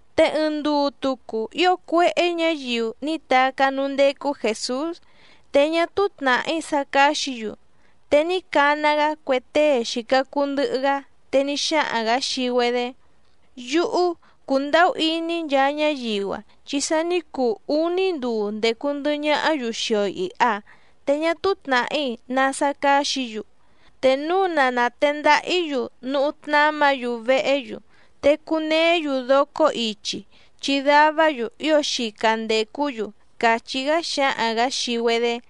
Te ɨɨⁿ nduu tucu ío cuéhé ñǎyiu ní tacá núú ndécú Jèsús, te ñá túú tnàhí sá cáxǐ‑yu. Te ní cana‑gá cue tée xìca cuu ndɨhɨ‑gá, te ní xáhaⁿ‑gǎ xii‑güedé: —Yúhú, cùndahú iní‑í nchaa ñáyiu‑a chi sa ní cuu úní nduu ndècu ndɨhɨ ñahá‑yu xii‑o ìha, te ñá túú tnàhí ná sá cáxǐ‑yu. Te núu na nàtendaha‑í‑yu núhú tnámǎ‑yu vehé‑yu, te cuneé‑yu docó ichi, chi davá‑yu ío xica ndècú‑yu —càchí‑gá xǎhaⁿ‑gǎ xii‑güedé.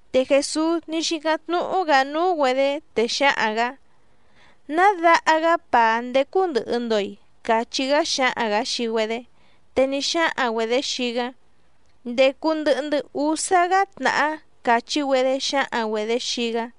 Te Jèsús ní xícáⁿ tnúhú‑gǎ núú‑güedě, te xǎhaⁿ‑gǎ: —¿Ná daha‑gá pàá ndécú ndɨ̀hɨ‑ndo‑i? —cachí‑gá xǎhaⁿ‑gǎ xii‑güedé. Te ní xáhaⁿ‑güedě xii‑gá: —Ndècu ndɨhɨ‑ndɨ́ úsá‑gá tnàhá —càchí‑güedé xǎhaⁿ‑güedě xii‑gá.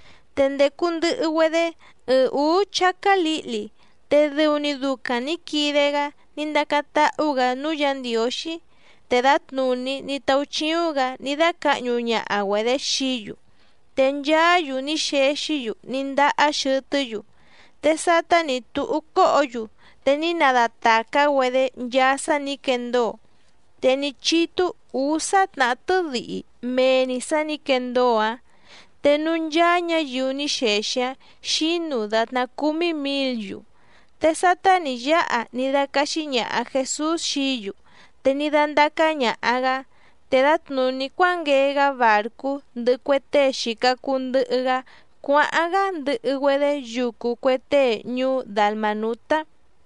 Te ndècu ndɨhɨ‑güedé ɨɨⁿ ǔú chácá lǐhli, te dɨu‑ni ducaⁿ nǐ quide‑gá ní ndacáⁿ táhú‑gǎ núú Yǎ Ndiǒxí. Te dǎtnùní ní táúchíúⁿ‑gǎ ní dácǎhñu ñaha‑güedě xií‑yu. Te nchaá‑yu ní xexí‑yu ní ndahá xɨtɨ́‑yu. Te sátá nǐ túhú cóhǒ‑yu te ní nadatàcá‑güedé nchaa sá nǐ quendóo, te ní chítú ǔsá tnàhá tɨ́dihi mee‑ni sǎ nǐ quendóo‑áⁿ. Te núú ncháá ñǎyiu ní xexi‑áⁿ xǐnu dàtná cúmí mǐl‑yu. Te sátá nǐ yáha ní dácáxí ñàha Jesús xií‑yu te ní dándácá ñàha‑gá. Te dǎtnùní cuánguee‑gá bàrcú ndɨhɨ cue tée xìca cuu ndɨhɨ‑gá cuáháⁿ‑gá ndɨhɨ‑güedé yucu cue tée ñuú Dalmànutá.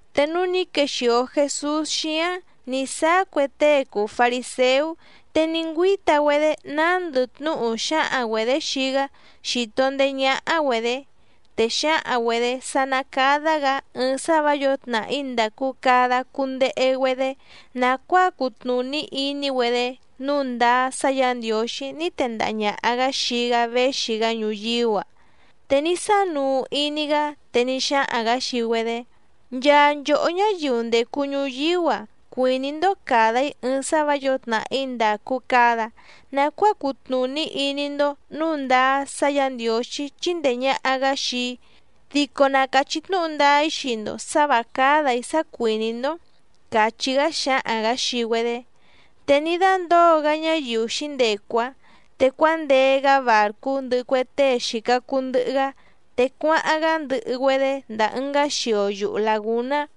Te núú nǐ quexìo Jesús xíáⁿ nǐ sáá cue tée cùu fariséú, te ní ngüíta‑güedé nándɨ tnúhu xáhaⁿ‑güedě xii‑gá xító ndèé ñáhá‑güedě. Te xǎhaⁿ‑güedě sá ná cádá‑gǎ ɨɨⁿ sá vǎ yǒo tnàhí ndàcu cada cundehe‑güedé nàcuáa cutnùní iní‑güedé nǔu ndáá sá Yǎ Ndiǒxí ní tendaha ñàha‑gá xii‑gá véxi‑gá ñuyíú‑a. Te ní sánuu iní‑gá te ní xáhaⁿ‑gǎ xii‑güedé: —Nchaa nchòhó ñáyiu ndècu ñuyíú‑a cuìní‑ndó càda‑í ɨɨⁿ sá vǎ yǒo tnàhí ndàcu cada nacuáa cutnùní iní‑ndó nǔu ndáá sá Yǎ Ndiǒxí chíndèe ñaha‑gá xii‑í. Dico na càchí tnúhu ndáá‑í xii‑ndo sǎ vǎ cádà‑í sá cuìní‑ndó —càchí‑gá xǎhaⁿ‑gǎ xii‑güedé. Te ní dándǒo‑gá ñáyiu xǐndecu‑áⁿ, te cuándee‑gá bàrcú ndɨhɨ cue tée xìca cuu ndɨhɨ‑gá te cuáháⁿ‑gá ndɨhɨ‑güedé ndàa ɨngá xio yuhu làgúná.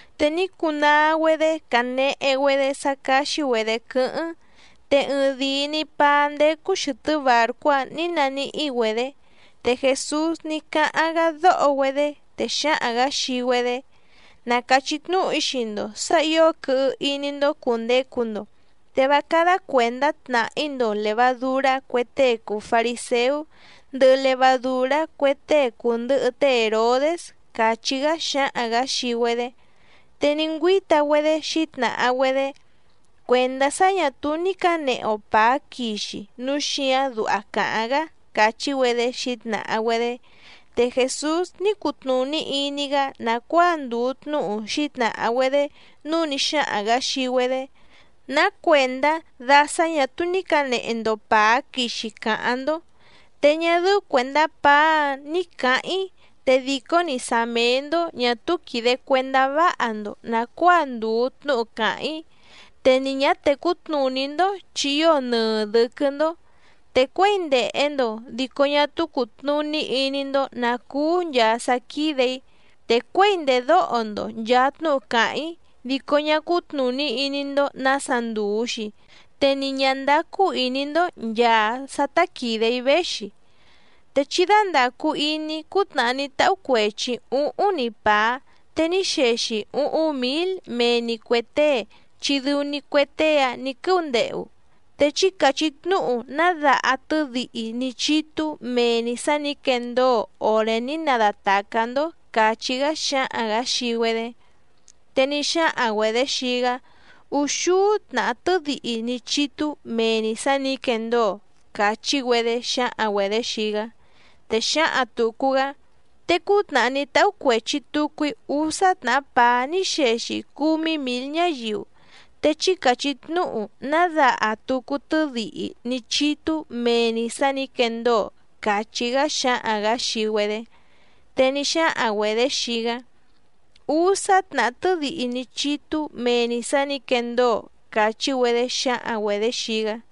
Te ní cunaa‑güedé canehe‑güedé sá cáxí‑güedě quɨ́hɨ́ⁿ, te ɨɨⁿdìi‑ni paá ndécú xɨ̀tɨ́ bàrcú‑áⁿ nǐ naníhí‑güedě. Te Jèsús ní cáháⁿ‑gá dóho‑güedé, te xǎhaⁿ‑gǎ xii‑güedé: —Na càchí tnúhu‑í xii‑ndo sǎ ǐo quɨhɨ iní‑ndó cùndecu‑ndo te vá cádá cuèndá tnàhí‑ndo lèvadurá cue tée cùu fariséú, ndɨhɨ levadùrá cue tée cùndɨhɨ té Hèrodés —càchí‑gá xǎhaⁿ‑gǎ xii‑güedé. Te ní ngüíta‑güedé xǐtnàha‑güedé: —Cuèndá sá ñà túú ní cǎnehe‑o pàá quixi núu xíǎⁿ duha càháⁿ‑gá —càchí‑güedé xǐtnàha‑güedé. Te Jèsús ní cutnùní iní‑gá nàcuáa ndùu tnúhu xǐtnàha‑güedé, núu ní xáhaⁿ‑gǎ xii‑güedé: —¿Ná cuèndá da sá ñà túú ní cǎnehe‑ndo pàá quixi càháⁿ‑ndó? Te ñá dɨ́ú cuèndá pàá‑áⁿ ní cǎháⁿ‑í, te dìcó‑ni sá méé‑ndó ñà túú quìde cuendá váha‑ndo nàcuáa ndùu tnúhu càháⁿ‑í, te ni ñǎ tècú tnùní‑ndó chi ío nɨɨ dɨ̌quɨ́‑ndó. Te cuěi ndèhe‑ndo dico ñá túú cùtnuní iní‑ndó nǎ cúú nchàa sá quídè‑í, te cuěi ndèdóho‑ndo nchàa tnúhu càháⁿ‑í dico ñá cútnùní iní‑ndó nǎsa ndùu‑xi, te ni ñǎ ndácú ìní‑ndó nchàa sá tá quìde‑í véxi. Te chí dándàcu iní cútnàhá ní táhú cuèchi‑í úhúⁿ‑ni pàá te ní xexi úhúⁿ mǐl mee‑ni cuè tée chi dɨu‑ni cue tée‑áⁿ nǐ quɨ́úndehu. Te chí càchí tnúhu ná daha tɨ́dihi ní chítú mee‑ni sǎ nǐ quendóo òré ní nadatàcá‑ndó —càchí‑gá xǎhaⁿ‑gǎ xii‑güedé. Te ní xáhaⁿ‑güedě xii‑gá: —Úxúú tnàhá tɨ́dihi ní chítú mee‑ni sǎ nǐ quendóo —càchí‑güedé xǎhaⁿ‑güedě xii‑gá. Te xǎhaⁿ tùcu‑gá: —Te cútnàhá ní táhú cuèchi tucu‑í úsá tnàhá pàá ní xexi cúmí mǐl ñáyiu, te chí càchí tnúhu ná daha tucu tɨ́dihi ní chítú mee‑ni sǎ nǐ quendóo —càchí‑gá xǎhaⁿ‑gǎ xii‑güedé. Te ní xáhaⁿ‑güedě xii‑gá: —Úsá tnàhá tɨ́dihi ní chítú mee‑ni sǎ nǐ quendóo —càchí‑güedé xǎhaⁿ‑güedě xii‑gá.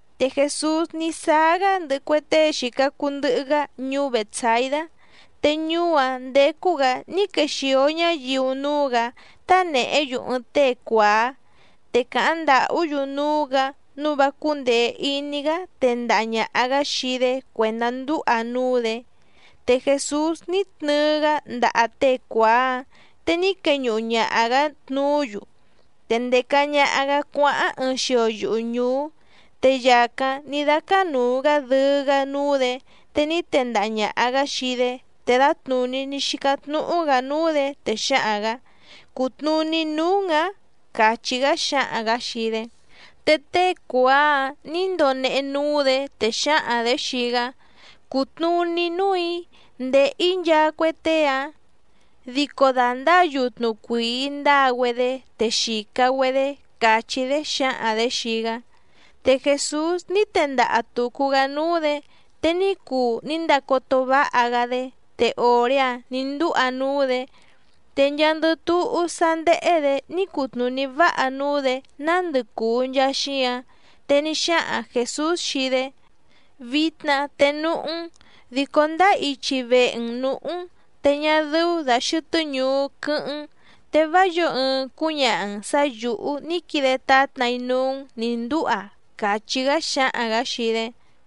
Te Jèsús ní sáá‑gá ndɨhɨ cue tée xìca cuu ndɨhɨ‑gá ñuú Bètsaidá. Te ñuú‑áⁿ ndécú‑gǎ ní quexìo ñáyiu núú‑gǎ tánèhé‑yu ɨɨⁿ tée cuàá, te càháⁿ ndàhú‑yu núú‑gǎ nǔu vá cúndèe iní‑gá tendaha ñàha‑gá xii‑dé cuèndá ndúha núú‑dě. Te Jèsús ní tnɨɨ‑gá ndaha tée cuàá‑áⁿ, te ní queñuhu ñaha‑gǎ tnuú‑yu, te ndèca ñaha‑gá cuáháⁿ ɨɨⁿ xio yuhu ñùú. Te yàcáⁿ ní dácánùu‑gá dɨɨ́‑gá núú‑dě te ní tendaha ñàha‑gá xii‑dé, te dǎtnùní ní xícáⁿ tnúhú‑gǎ núú‑dě, te xǎhaⁿ‑gǎ: —¿Cùtnuní núú‑n‑ǎⁿ? —càchí‑gá xǎhaⁿ‑gǎ xii‑dé. Te tée cuàá‑áⁿ nǐ ndonehe núú‑dě, te xǎhaⁿ‑dě xii‑gá: —Cùtnuní núù‑í ndéhè‑í nchaa cue tée‑ǎⁿ, dico dà ndáa yutnu cuìi ndáa‑güedé te xìca‑güedé —càchí‑dé xǎhaⁿ‑dě xii‑gá. Te Jèsús ní tendaha tùcu‑gá núú‑dě te ní cuu ní ndacoto váha‑gá‑dé, te òré‑áⁿ nǐ ndúha núú‑dě. Te nchaandɨ túhú sá ndéhé‑dě ní cutnùní váha núú‑dě nándɨ cùu nchaa xíǎⁿ. Te ní xáhaⁿ Jèsús xii‑dé: —Vitna te núhú‑n, dico ndáá ichi vehe‑n nǔhú‑n te ñá dɨ́ú dà xɨtɨ́ ñuú quɨ́hɨ́ⁿ‑n, te vá yǒo ɨɨⁿ cúñaha‑n sǎ yǔhú ní quide tátna‑í núú‑n nǐ ndúha —càchí‑gá xǎhaⁿ‑gǎ xii‑dé.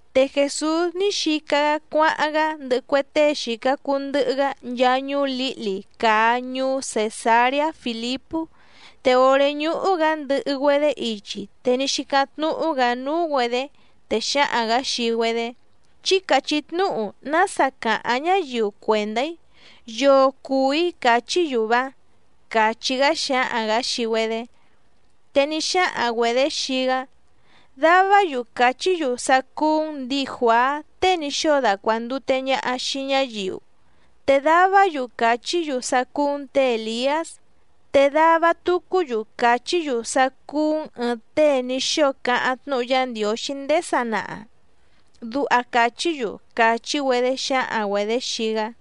Te Jèsús ní xica‑gá cuáháⁿ‑gá ndɨhɨ cue tée xìca cuu ndɨhɨ‑gá nchaa ñuú lǐhli càa ñuú Cèsareá Fìlipú, te òré ñúhú‑gǎ ndɨhɨ‑güedé ichi te ní xícáⁿ tnúhú‑gǎ núú‑güedě, te xǎhaⁿ‑gǎ xii‑güedé: —Chí càchí tnúhu nása càháⁿ ñáyiu cuèndá‑í. ¿Yoo cùu‑í càchí‑yu‑va? —càchí‑gá xǎhaⁿ‑gǎ xii‑güedé. Te ní xáhaⁿ‑güedě xii‑gá: —Davá‑yu càchí‑yu sá cúú‑n ndǐi Juàá tée ní xóo dacuàndute ñaha xii ñáyiu, te davá‑yu càchí‑yu sá cúú‑n tě Èliás, te dava tucú‑yu càchí‑yu sá cúú‑n ɨ̀ɨⁿ tée ní xóo cáháⁿ tnúhu Yá Ndiǒxí ndéé sanaha, duha càchí‑yu —càchí‑güedé xǎhaⁿ‑güedě xii‑gá.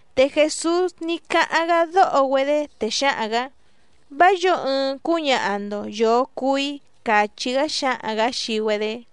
Te Jèsús ní cáháⁿ‑gá dóho‑güedé, te xǎhaⁿ‑gǎ: —Vá yǒo ɨɨⁿ cúñaha‑ndo yòo cuu‑í —càchí‑gá xǎhaⁿ‑gǎ xii‑güedé.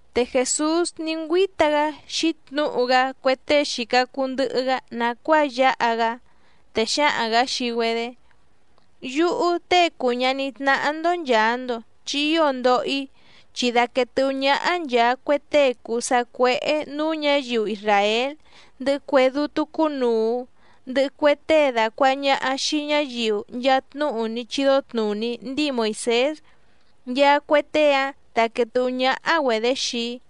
Te Jèsús ní ngüíta‑gá xǐtnǔhu‑gá cue tée xìca cuu ndɨhɨ‑gá nàcuáa yáha‑gá, te xǎhaⁿ‑gǎ xii‑güedé: —Yúhú Tée cùu ñaní tnáhá‑ndó nchàa‑ndo chi ío ndoho‑í, chi daquèe tɨ́hú ñáhá nchàa cue tée cùu sacuéhé nǔú ñǎyiu isràél, ndɨhɨ cue dútú cúnùu, ndɨhɨ cue tée dàcuaha ñaha xii ñáyiu nchaa tnúhu ní chídó tnùní ní chídó tnùní ndíi Moìsés, nchaa cue tée‑áⁿ dàquee tɨhú ñáhá‑güedě xii‑í.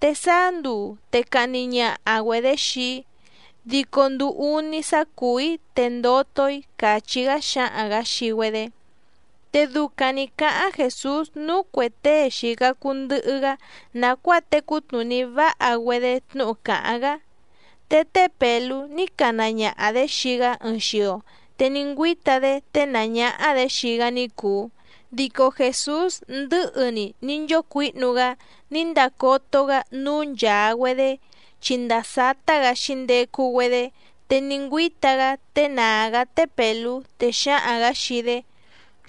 Te sáá nduu te cahni ñaha‑güedě xii‑í, dico nduu úní sá cùú‑í te ndoto‑í —càchí‑gá xǎhaⁿ‑gǎ xii‑güedé. Te ducaⁿ nǐ cáháⁿ Jèsús núú cuè tée xìca cuu ndɨhɨ‑gá nàcuáa tecú tnùní váha‑güedé tnúhu càháⁿ‑gá. Te té Pèlú ní cana ñaha‑dě xii‑gá ɨɨⁿ xio, te ní ngüíta‑dé ténàá ñáhá‑dě xii‑gá ní cùu. Dico Jèsús ndɨ̌hɨ‑ni ní nchócuǐhnu‑gá ní ndàcoto‑gá núú nchàa‑güedé chi ndàa sátá‑gǎ xǐndecu‑güedé, te ní ngüíta‑gá ténàá‑gá té Pèlú, te xǎhaⁿ‑gǎ xii‑dé: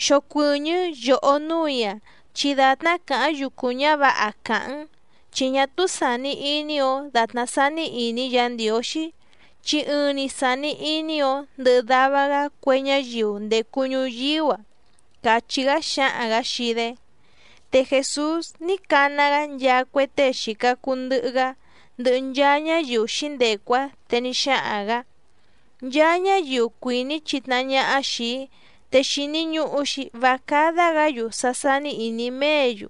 —¡Xocuɨ̀ñɨ́ yòhó núù‑í‑a, chi dàtná càháⁿ yucu ñǎvǎha càháⁿ‑n! Chi ñá túú sàni iní‑ǒ dàtná sání ìní Yǎ Ndiǒxí, chi ɨɨⁿ‑ni sàni iní‑ǒ ndɨhɨ dava‑gá cue ñáyiu ndècu ñuyíú‑a —càchí‑gá xǎhaⁿ‑gǎ xii‑dé. Te Jèsús ní cana‑gá nchaa cue tée xìca cuu ndɨhɨ‑gá, ndɨhɨ nchaa ñáyiu xǐndecu‑áⁿ, te ní xáhaⁿ‑gǎ: —Nchaa ñáyiu cuìní chitnahá ñáhá xìi‑í, te xìni ñuhu‑xi vá cádá‑gǎ‑yu sá sání ìní méě‑yu,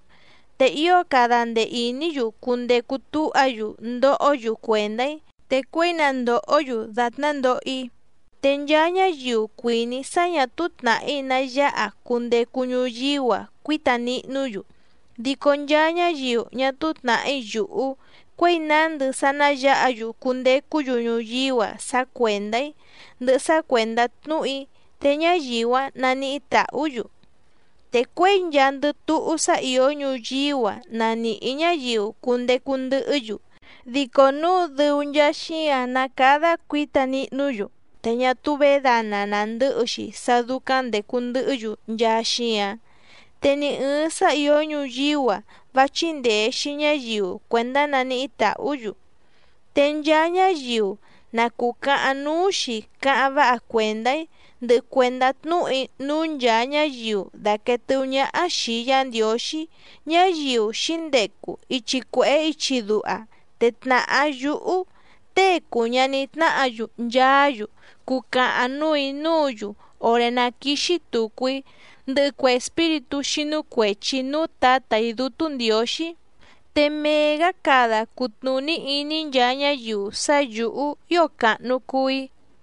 te ío cada ndee ìní‑yu cundecu túha‑yu ndohó‑yu cuèndá‑í, te cuěi na ndòhó‑yu dàtná ndoho‑í. Te nchaa ñáyiu cuìní sá ñà túú tnàhí ná yáha cundecu ñuyíú‑a cuíta nihnú‑yu, dico nchaa ñáyiu ñá túú tnàhí yùhú cuěi nándɨ sá ná yǎha‑yu cundecú‑yu ñuyíú‑a sá cuèndá‑í, ndɨhɨ sá cuèndá tnúhu‑í, te ñáyiu‑áⁿ naníhí tàhú‑yu. Te cuěi nchaandɨ túhú sá ìó ñuyíú‑a na nìhí ñáyiu cundecu ndɨhɨ́‑yu, dico núu dɨu nchaa xíǎⁿ ná càda cuíta nihnú‑yu te ñá túú vědana nàndɨ́hɨ‑xi sá dúcáⁿ ndècu ndɨhɨ́‑yu nchaa xíǎⁿ. Te ni ɨ̀ɨⁿ sá ìó ñuyíú‑a vá chíndèe‑xi ñáyiu cuèndá naníhí tàhú‑yu. Te nchaa ñáyiu na cùcahaⁿ núú‑xi cáháⁿ váha cuèndá‑í, ndɨhɨ cuèndá tnúhu‑í núú nchàa ñáyiu dàquee tɨhú ñáhá xìi Yá Ndiǒxí, ñáyiu xǐndecu ichi cuèhé ichi duha, te tnàhá yúhú Tée cùu ñaní tnáhǎ‑yu nchaá‑yu cucahaⁿ núù‑í núǔ‑yu òré ná quìxi tucu‑í ndɨhɨ cue espíritú xínú cuèchi núú Tǎtà‑í Dútú Ndiǒxí. Te mee‑gǎ cada cutnùní iní nchaa ñáyiu sá yǔhú ío càhnu cuu‑í.